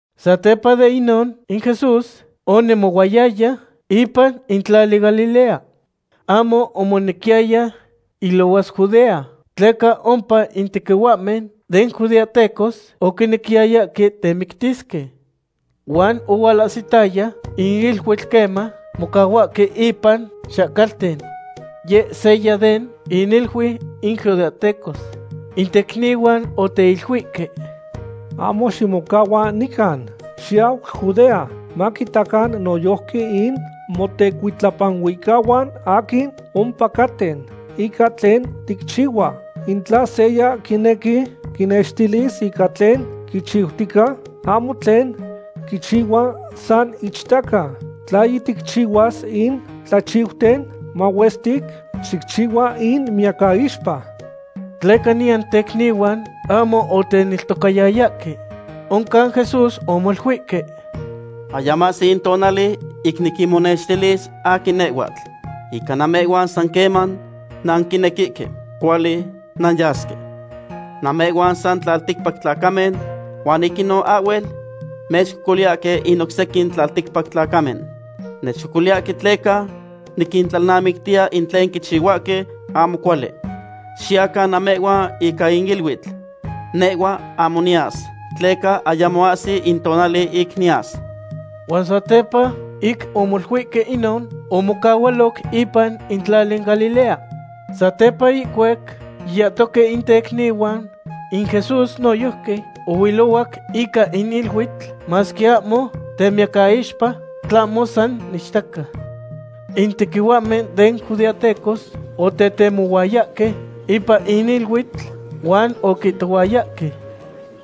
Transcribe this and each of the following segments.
Satepa den inon in Jesús onemohuayaya ipan in tlali Galilea. Ahmo omonequiya ilohuas Judea, tleca ompa in tequihuahmen den judeahtecos oquinequiyayahque temictisque. Huan ohualahsitaya in iluitl queman mocahuahque ipan xahcalten. Yeh seya den iniluiu in judeahtecos. In tecnihuan oteiluihque: ―Ahmo ximocahua nican. Xiyau Judea, maquitacan noyojqui in motecuitlapanuicahuan aquin ompacaten ica tlen ticchihua. In tla seya quinequi quinextilis ica tlen quichiutica, ahmo tlen quichihua san ichtaca. Tla yiticchihuas in tlachiuten mahuestic, xicchihua miyacaixpa. Tleca niyan tecnihuan ahmo oteneltocayayahque. Oncan Jesús omoluihque: ―Ayamo ahsi in notonal ic niquinmonextilis aquin nehhhuatl. Ica namehhuan san queman nanquinequihque, cuali nanyasque. Namehhuan san tlalticpac tlacamen huan ic inon ahhuel mechcocoliyahque in oc sequin tlalticpac tlacamen. Nechcocoliyahque tleca niquintlalnamictiya in tlen quichihuahque ahmo cuali. Xiyacan namehhuan ica in iluitl; nehhua ahmo niyas, tleca ayamo ahsi in tonali ic niyas. Huan satepa ic omoluihque inon, omocahualoc ipan in tlali Galilea. Satepa ihcuac yiyahtoque in tecnihuan, in Jesús noyojqui ohuilohuac ica in iluitl, masque ahmo temiyacaixpa, tlahmo san ichtaca. In tequihuahmen den judeahtecos otetemohuayahque ipan in iluitl, huan oquihtohuayahque: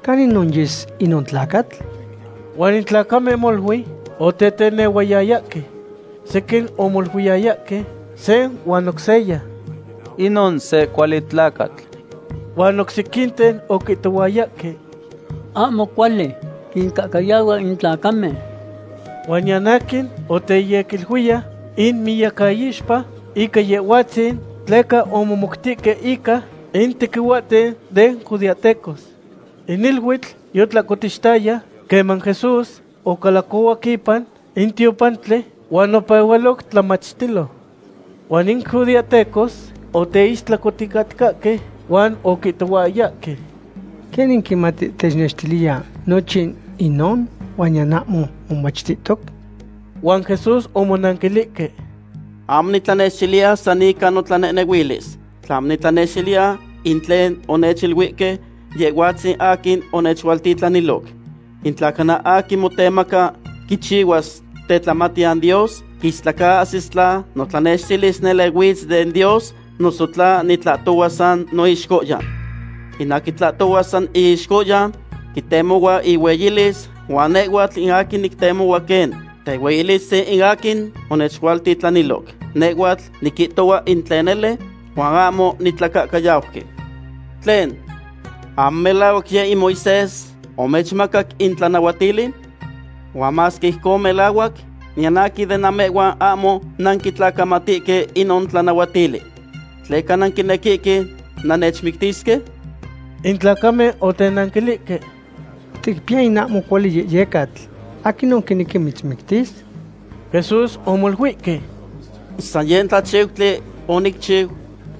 ―¿Caninon yes inon tlacatl? Huan in tlacamen molui otetenehuayayahque. Sequin omoluiyayahque se huan oc seya: “Inon se cuali tlacatl”, huan oc sequinten oquihtohuayahque: “Ahmo cuali, quincahcayahua in tlacamen.” Huan niyan aquin oteyequiluiya inmiyacaixpa ica Yehhuatzin, tleca omomoutihque ica in tequihuahten den judeahtecos. In iluitl yotlahcotixtaya queman Jesús ocalacohuac ipan in tiopantli, huan opehualoc tlamachtilo. Huan in judeahtecos oteistlacoticatcahque huan oquihtohuayahque: ―¿Quenin quimati technextiliya nochin inon huan niyan ahmo momachtihtoc? Huan Jesús omonanquilihque: ―Ahmo nitlanextiliya san ica notlanehnehuilis, tlahmo nitlanextiliya in tlen onechiluihque Yehhuatzin aquin onechualtitlaniloc. In tla cana aquin motemaca quichihuas tetlamatiyan Dios, quistlacaahsis tla notlanextilis nele huitz den Dios noso tla nitlahtohua san noixcohyan. In aquin tlahtohua san iixcohyan, quitemohua ihueyilis, huan nehhuatl in aquin nictemo quen tehueyilistzin in aquin onechualtitlaniloc. Nehhuatl niquihtohua in tlen nele, huan ahmo nitlacahcayauqui. ’¿Tlen, ahmo melahuac yeh in Moisés omechmacac in tlanahuatili? Huan masque ijcon melahuac, niyan aquin den namehhuan ahmo nanquitlacamatihque inon tlanahuatili. ¿Tleca nanquinequihque nannechmictisque? In tlacamen otenanquilihque: ―Ticpiya in ahmo cuali yehyecatl. ¿Aquinon quinequi mitzmictis? Jesús omoluihque: ―San se tlachiutli onicchiu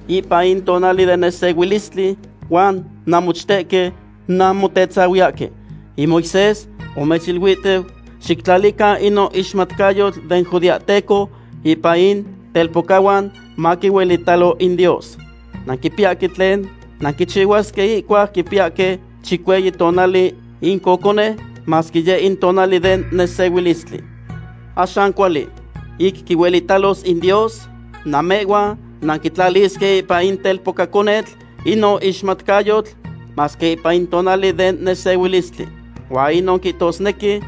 ipan in tonali den nesehuilistli, huan namochtehque nanmotetzahuiyahque. In Moisés omechiluihtiu xictlalican inon ixmatcayotl den judeahteco ipan in telpocahuan maquinuelitalo in Dios. Nanquipiyahque tlen nanquichihuasque ihcuac quipiyahque chicueyi tonali in cocone, masque yeh in tonali den nesehuilistli. Axan cuali, ic quihuelitalos in Dios, namehhuan nanquitlalisque ipan in telpocaconetl inon ixmatcayotl, masque ipan in tonali den nesehuilistli. Huan inon quihtosnequi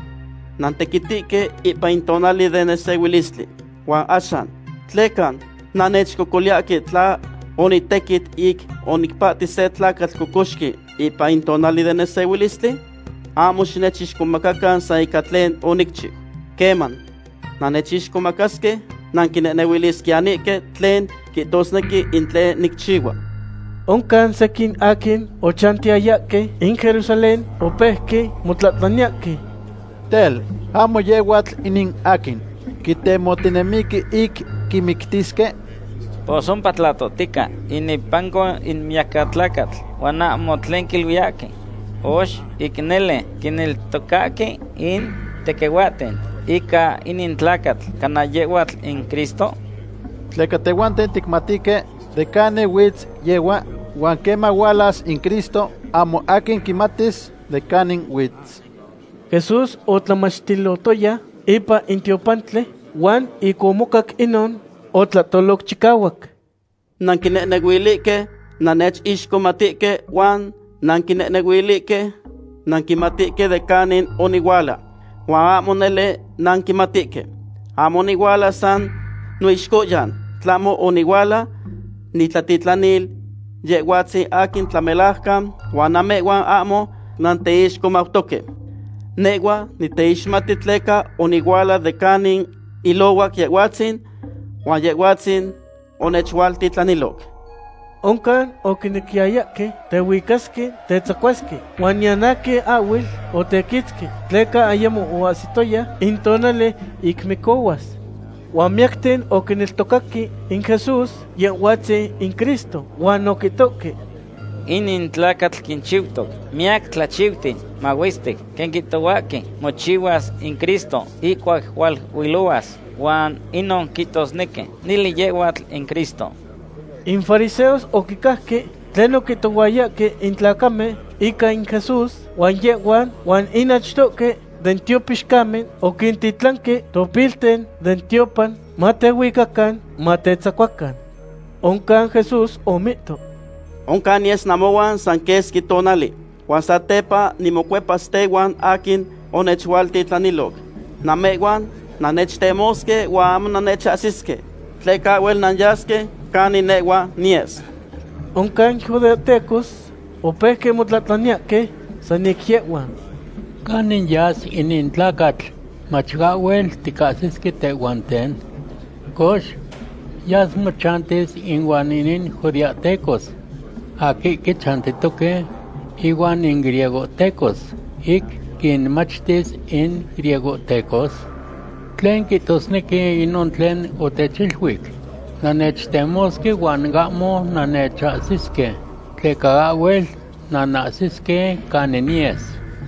nantequitihque ipan in tonali den nesehuilistli. ¿Huan axan, tleca nannechcocoliyahque tla onitequit ic onicpahti se tlacatl cocoxqui ipan in tonali den nesehuilistli? Ahmo xinechixcomacan san ica tlen onicchiu. Queman nannechixcomacasque, nanquinehnehuilisquiyanihque tlen quihtosnequi in tlen nicchihua. Oncan sequin aquin ochantiyayahque in Jerusalén opeuque motlahtlaniyahque: ―Tel, ¿ahmo yehhuatl inin aquin quitemohtinemihque ic quimictisque? Pos ompa tlahtohtica inepanco in miyacatlacatl, huan ahmo tlen quiluiyahque. Cox, ¿ic nele quineltocahque in tequihuahten ica inin tlacatl cana yehhuatl in Cristo? Tleca tehhuanten ticmatihque de canin huitz yehhua, huan queman hualas in Cristo, ahmo aquin quimatis de canin huitz. Jesús otlamachtilotoya ipan in tiopantli, huan ic omocac inon, otlahtoloc chicahuac: ―Nanquinehnehuilihque nannechixmatihque huan nanquinehnehuilihque nanquimatihque de canin onihuala. Huan ahmo nele nanquimatihque. Ahmo onihuala san noixcohyan, tlahmo onihuala nitlatitlanil Yehhuatzin aquin tlamelajcan huan namehhuan ahmo nanteixmautoque. Nehhua niteixmati tleca onihuala de canin ilohuac Yehhuatzin, huan Yehhuatzin onechualtitlaniloc. Oncan oquinequiyayahque tehuicasque tetzacuasque, huan niyan aquin ahhuel otequitzqui, tleca ayamo oahsiyaya in tonali ic micohuas. Huan miyacten oquineltocaque in Jesús Yehhuatzin in Cristo, huan oquihtohque: ―Inin tlacatl quinchiutoc miyac tlachiuten mahuestic quen quihtohuahque mochihuas in Cristo ihcuac hualuilohuas huan inon quihtosnequi nele yehhuatl in Cristo. In fariseos oquicajque in tlen oquihtohuayahque in tlacamen ica in Jesús, huan yehhuan huan in achtohque den tiopixcamen oquintitlanque topilihten den tiopan matehuicacan matetzacuacan. Oncan Jesús omihto: ―Oncan niyes namohuan sa quesqui tonali, huan satepa nimocuepas tehuan aquin onechualtitlaniloc. Namehhuan nannechtemosque huan ahmo nannechahsisque, tleca ahhuel nanyasque canin nehhua niyes. Oncan in judeahtecos opeuque motlahtlaniyahque san ic yehhuan: ―¿Canin yas inin tlacatl mach ahhuel ticahsisque tehhuanten? Cox, ¿yas mochantis inuan in judeahtecos aquihque chantihtoque ihuan in griegohtecos, ic quinmachtis in griegohtecos? ¿Tlen quihtosnequi inon tlen otechiluic: “Nannechtemosque huan ahmo nannechahsisque, tleca ahhuel nanahsisque canin niyes”?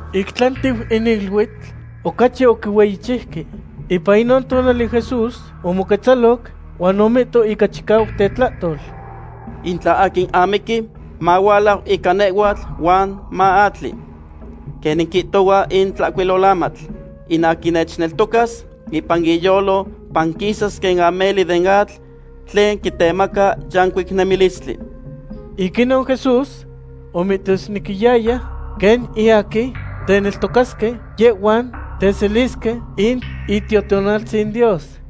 Ic tlantiu in iluitl ocachi oquihueyichiuque. Ipan inon tonali Jesús omoquetzaloc huan omihto ica chicahuac tetlahtol: ―In tla aquin amiqui, mahualau ica nehhuatl huan maatli. Quenin quihtohua in Tlahcuilolamatl, in aquin nechneltocas, ipan iyolo panquisas quen ameli den atl tlen quitemaca yancuic nemilistli. Ic inon Jesús omihtosnequiyaya quen in aquin teneltocasque, yehhuan teselisque in Itiotonaltzin Dios.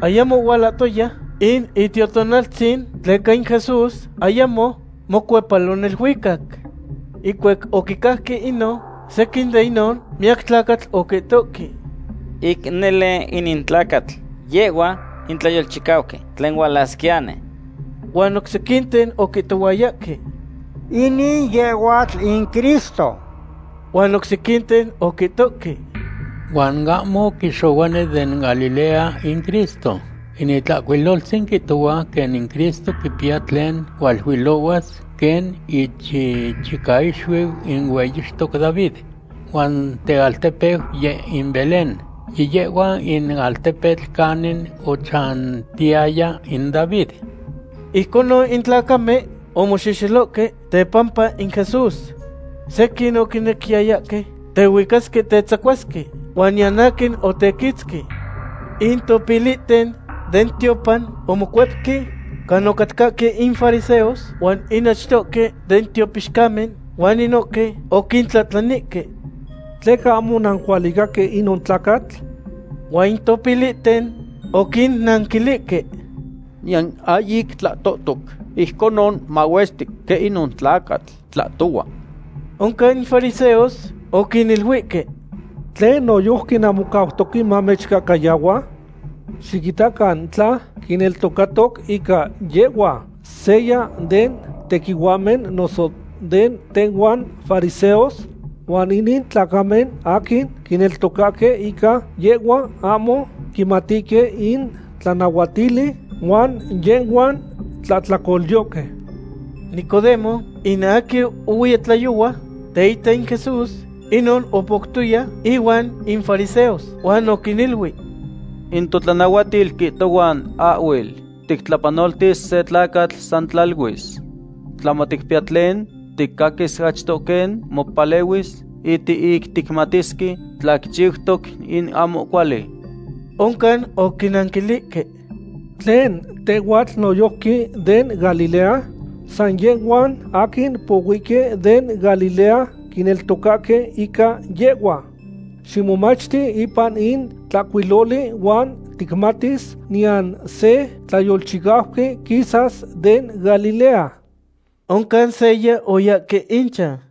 Ayamo ohualahtoya in Itiotonaltzin tleca in Jesús ayamo mocuepalo neluicac. Ihcuac oquicajque inon, sequin den inon miyacatlacatl oquihtohque: ―Ic nele inin tlacatl yehhua in tlayolchicauqui tlen hualasquiyani. Huan oc sequinten oquihtohuayahque: ―Inin yehhuatl in Cristo. Huan oc sequinten oquihtohque: ―Huan ahmo quixohuani den Galilea in Cristo. In Itlahcuiloltzin quihtohua quen in Cristo quipiya tlen hualuilohuas quen ichichicaixuiu in hueyixtoc David, huan tealtepeu yeh in Belén, yiyehhua in altepetl canin ochantiyaya in David. Ijconon in tlacamen omoxehxelohque tepampa in Jesús. Sequin oquinequiyayahque tehuicasque tetzacuasque, huan niyan aquin otequitzqui. In topilihten den tiopan omocuepque canin ocahcatca in fariseos huan in achtohque den tiopixcamen, huan inohque oquintlahtlanihque: ―¿Tleca ahmo onanquihualicaque inon tlacatl? Huan in topilihten oquinnanquilihque: ―¡Niyan aquin ahyic tlahtotoc ijconon mahuestic quen inon tlacatl tlahtohua! Oncan in fariseos oquiniluihque: ―¿Tlen, noyojqui nanmocautoque mamechcahcayahua? ¡Xiquitacan tla quineltocatoc ica yehhua seya den tequihuahmen noso den tehhuan fariseos! Huan inin tlacamen aquin quineltocahque ica yehhua ahmo quimatihque in tlanahuatili, huan yehhuan tlahtlacolyohque. Nicodemo, in aquin ohuiya tlayohua teita in Jesús, inon opoutoya inuan in fariseos, huan oquiniluic: ―In totlanahuatil quihtohua ahhuel tictlapanoltisque se tlacatl san tlaluis. Tlahmo ticpiyahque tlen ticaquisque achto quen mopalehuis ic ticmatisque tla quichiutoc in ahmo cuali. Oncan oquinanquilihque: ―¿Tlen, tehhuatl noyojqui den Galilea? San yehhuan aquin pohuihque den Galilea quineltocahque ica yehhua. Ximomachti ipan in tlahcuiloli huan ticmatis niyan se tlayolchicauqui quisas den Galilea. Oncan se seya oyahque inchan.